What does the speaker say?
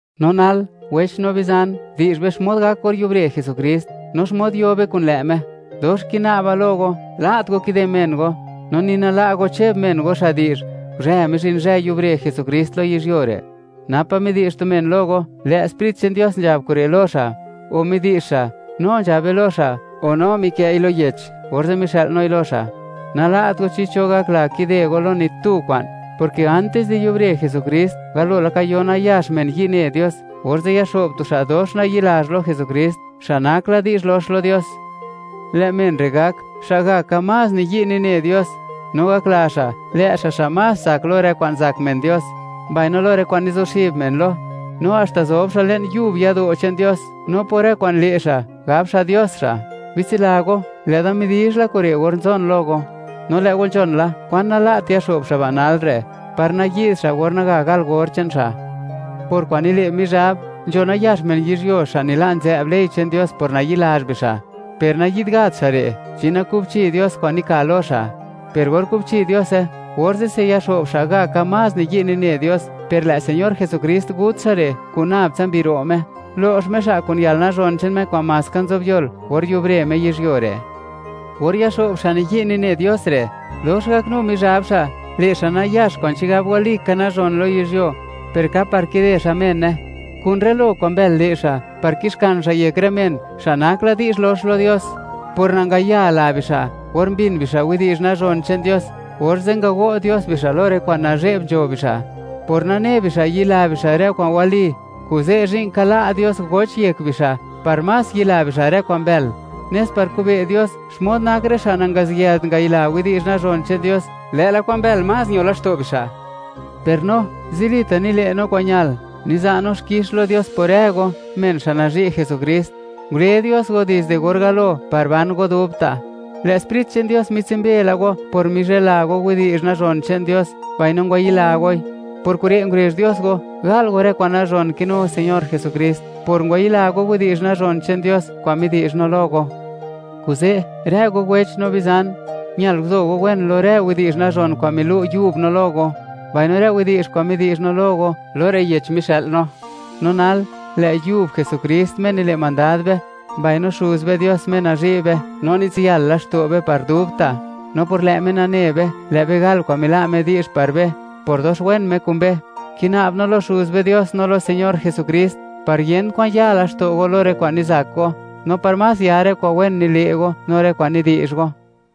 No nal, wech no bizan, di'zh be xmod gak or yubre Jesukrist, no xmod yo be kun lë' Me. Dox kina'ba lo go, nala't go kide men go, no ni nala' go cheb men go, xa' di'zh: “Guzhë mizhin zhë yubre Jesukrist lo yizhyuo re'.” Napa' midi'zh tu men lo go, lë' Sprit che'n Dios nzhab kure' lo xa'; o midi'zh xa', no nzhabe lo xa'; o no mikë'i lo yech, orze' mixë'l noi lo xa'. Nala't go chi cho gakla kide go lo ni tu kwa'n, porke antis di yubre Jesukrist, galo laka yo nayax men yi' ne Dios, orze' yaxo'b tu xa' dox nayi'lazh lo Jesukrist, xa' nak la di'zh, lox lo Dios. Lë' men re' gak, xa'gaka más niyi' nine Dios, no gakla xa', lë' xa', xa' más tsak lo rë kwa'n zak men Dios, mbaino lo rë kwa'n nizuxib men lo; no haxta zob xa' le'n pa' yado' che'n Dios, no por rë kwa'n le' xa', gab xa' Dios xa'. Bitsila go, lë' da midizh la kure' or nzon lo go. No lë' go nzhon la kwan nala't yaxo'b xa' ba' nal re', par nayi'd xa' or naga gal or che'n xa'. Por kwa'n nile' Mizhab, nzho nayax men yizhyuo xa' nila' nzë'b ley che'n Dios por nayi'lazh bixa'. Per nayi'd gat xa' re', chi nakubchi Dios kwa'n nika lo xa'. Per or kubchi Diose, orze'se yaxo'b xa'gaka más niyi' nine Dios, per lë' Señor Jesukrist gut xa' re' kun nab tsa mbi ro' Me, lo'x Me xa' kun yalnazhon che'n Me kwa'n maska nzob yol or yubre Me yizhyuo re'. Or yaxo'b xa' nayi' nine Dios re', dox gaknu Mizhab xa', le' xa' nayax kwa'n chigab walika nazhon lo yizhyuo, per ka par kide xa' mene; kun rë lo kwa'n mbël le' xa' par kixkan xa' yek rë men, xa' nak la di'zh lox lo Dios por nangaya la bixa' or mbin bixa' widi'zh nazhon che'n Dios, orze' ngago' Dios bixa' lo rë kwa'n nazhe'b nzho bixa'. Por nane bixa' yila bixa' rë kwa'n wali, kuze' zhi'n ka la' Dios goch yek bixa' par más yila bixa' rë kwa'n mbël, nes par kube' Dios xmod nak rë xa' nangaziyëlt ngayila widi'zh nazhon che'n Dios, lë'la kwa'n mbël más ño laxto' bixa'. Per no, zilita' nile' no kwa'n ñal, niza' no xkix lo Dios por rë go, men xa' nazhi' Jesukrist. Ngule Dios go dizde or galo par ban go dubta'; lë' Sprit che'n Dios mitsumbe la go por mizhela go widi'zh nazhon che'n Dios, mbaino ngwayila goi. Por kure' ngurezh Dios go, gal go rë kwa'n nazhon kinu Señor Jesukrist, por ngwayila go widi'zh nazhon che'n Dios kwa'n midi'zh no lo go. Kuze', rë go wech no bizan; ñal guzo go wen lo rë widi'zh nazhon kwa'n milu' yub no lo go, mbaino rë widi'zh kwa'n midi'zh no lo go, lo rë yech mixë'l no. No nal, lë' yub Jesukrist, Me nile' mandad be, mbaino Xuz be Dios, Me nazhi' be no nitsiyal laxto' be par dubta', no por lë' Me nane be, lë' be gal kwa'n mila' Me di'zh par be por dox wen Me kun be; kina'b no lo Xuz be Dios no lo Señor Jesukrist, par yent kwan ya laxto' go lo rë kwa'n nizak go, no par más yar rë kwa'n wen nile' go no rë kwa'n nidi'zh go.